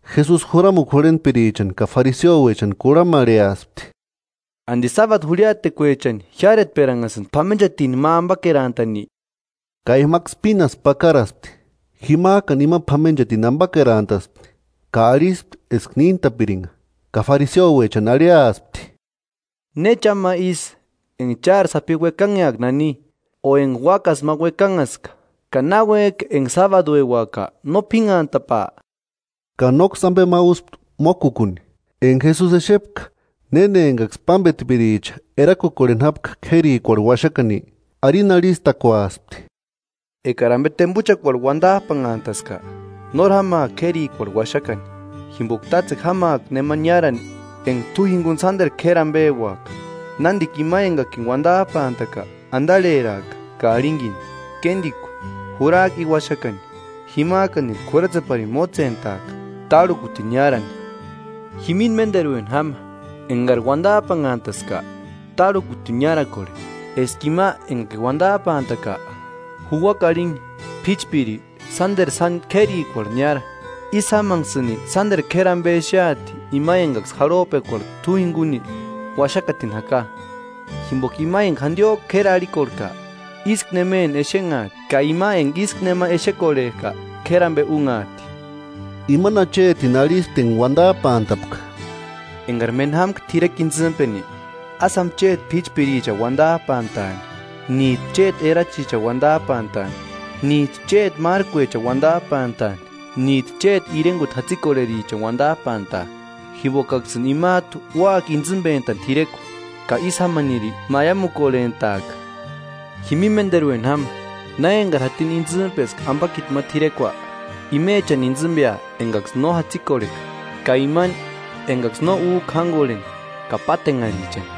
Jesusi juramukua jurhentpirichani ka fariseoechani kurhamarheaspti: –¿Andi sábadu jurhiaatekuechani jiáretperanhasïnki p'amenchatini ma ambakerantani? Ka imaksï pínasku pakarasti. Jimajkani ima p'amenchatini ambakerantaspti ka arhispti eska níntapiringa. Ka fariseoechani arhiaspti: –¿Ne cha ma isï, enga chári sapi uekanheaka nani o enga úakasï ma uekanhaska; ka náuejki enga sábadueuaka no p'ínhantapaa? Ka nóksï ambe ma úspti mókukuni. Enga Jesusi exepka néna engaksï pámbetpiricha erakukorheni jápka k'érikuarhu uaxakani, arini arhistakuaspti: 8–Ekari ambe tembuchakuarhu uandajpanhantaska, nóri jámaaka k'érikuarhu uaxakani, jimboka tátsekua jámaaka nema niárani enga t'u jinguni sánderu k'éri ambeuaka; nándika ima engakini uandajpantaka andarheraaka ka arhinkini: Kéndiku, jurajku i uaxakani. Jimajkaniri k'uratseparini mótsentaaka, tárhukutini niárani. Jimini ménderueni jama, engari uandajpanhantaska, tárhukutini niárakorhe, eska ima engakini uandajpantaka juuaka arhini: P'íchpiri, sánderu sáni k'érikuarhu niára. Ísï jámanksïni sánderu k'éri ambe exeati ima engaksï jarhojpekuarhu t'u jinguni uaxakatini jaka. Jimboka ima enga jandiojku k'éri arhikorhejka, ísku nemeni exenhaati; ka ima enga ísku nema exekorhejka, k'éri ambe únhaati. Imani achetini arhispti enga uandajpantapka: –Engari méni jámka t'irekua intsïmpeni, ásï jáma chéti p'íchpirichani uandajpantaani, níjtu chéti erachichani uandajpantaani níjtu chéti márkuechani uandajpantani, níjtu chéti irenguti jatsikorherichani uandajpantaa; jimbokaksïni imajtu úaka intsïmbentani t'irekua, ka ísï jámaniri maiamukorhentaaka. Jimini ménderueni jáma, na engari jatini intsïmpeska ambakiti ma t'irekua, imechani intsïmbea engaksï no jatsikorheka, ka imani engaksï no újka jángorheni, ka pátenharhichani;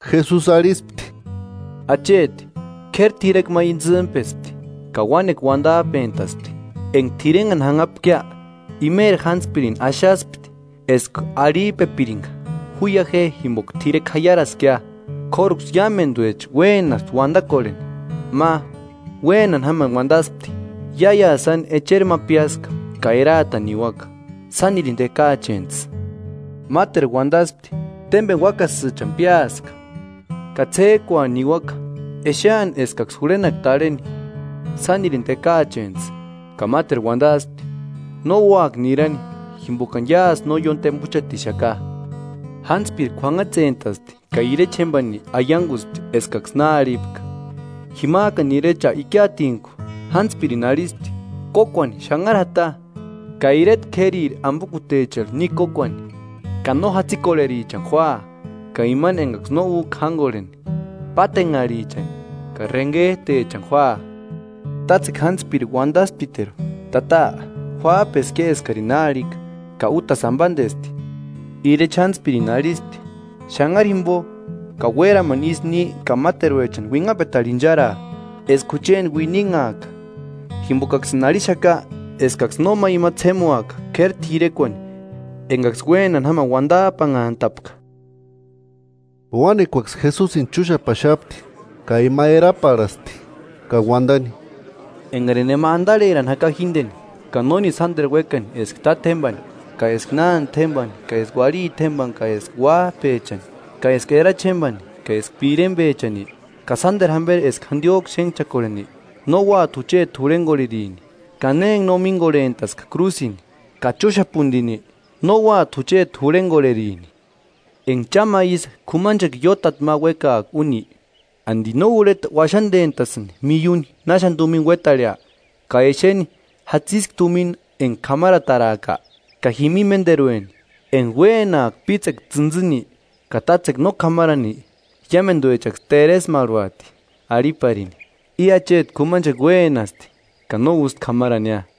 Jesusi arhispti: –Acheti k'éri t'irekua ma intsïmpespti, ka uánekua uandajpentaspti. Enga t'irenhani janhapkia, imeri jántspirini axaspti eska arhijpepiringa: Juia je jimboka t'irekua jaiaraskia. K'óruksï iámenduecha uénaspti uandakorheni. Ma, uénani jámani uandaspti: Iáiasï echeri ma piáska ka eraatani niuaka. Sánirini tekaachentsï. Máteru uandaspti: Témbeni úakasïchani piáska, ka ts'éjkuani niuaka exeani eskaksï jurhenaka tarheni, sánirini tekaachentsï. Ka máteru uandaspti: No úaka nirani jimbokani iásï no ióni tembuchatixaka. Jántspiri k'uanhatsespti ka irecha jémbani aianguspti eskaksï na arhipka. Jimajkani irecha ikiatintku jántspirini arhispti: Kókuani xanharu jata, ka ireta k'ériri ambokutecharhu ni kókuani, ka no jatsikorherichani júaa, ka imani engaksï no újka jángorheni, pátenharhichani ka renhejtechani júaa. Tátsekua jántspiri uandasptiteru: Tata, juájpeskia eskarini na arhika, ka útasï ambandesti. Irecha jántspirini arhispti: Xanhari jimbo ka uéramani isï ni ka máteruechani uinhapetarhu incharaa, eska jucheni uininhaaka. Jimbokaksïni arhixaka eskaksï nóma ima ts'émuaka k'éri t'irekuani engaksï uénani jámani uandajpanhantapka. Uánekuaksï Jesusini chúxapaxapti; ka ima eraparhasti ka uandani: “Engarini nema andarherani jaka jíndeni ka nórini sánderu uékani eska tátjembani ka eska nánde jémbani ka eska uarhiti jémbani ka eska uájpechani ka eska erachi jémbeni ka eska pirembechani, ka sánderu jamberi eska jandiojku xénhchakorheni, no úati jucheti jurhengorherini. Ka ne enga no míngorhentaska krúsini ka chúxapunirini, no úati jucheti jurhengorherini. Enga cha ma ísï k'umanchekua iótati ma uékaaka úni, ¿Andi no urheta uaxandentasïnki miuni náxani tumina uétarhea, ka exeni jatsiski tumina enga k'amarataraaka? Ka jimini ménderueni, enga uénaaka pítsekua tsïntsïni ka tátsekua no k'amarani, iámenduechaksï teresmarhuati, arhiparini: I acheti k'umanchekua uénasti, ka no ústi k'amarania,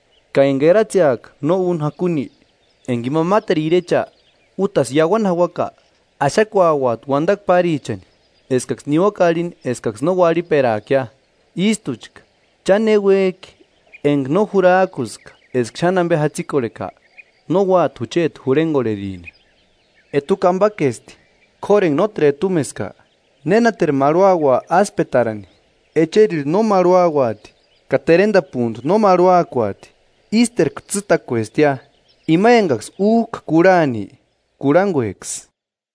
Ka enga eratseaka no úni jakuni, enga ima máteru irecha útasï iauani jauaka, axakuauati uandakua párichani eskaksï niuaka arhini eskaksï no uarhiperaakia. Ístuchka cha ne uéjki enga no jurajkuska eska xáni ambe jatsikorheka, no úati jucheti jurhengorherini.” “Etukua ambakesti; k'óru enga nóteru etumeska, ¿Nénateru marhuaua áspetarani? Echerirhu no marhuauati, ka terendapuntu no marhuakuati, ísterku tsîtakuestia. Ima engaksï újka kurhani, kurhangueksï.”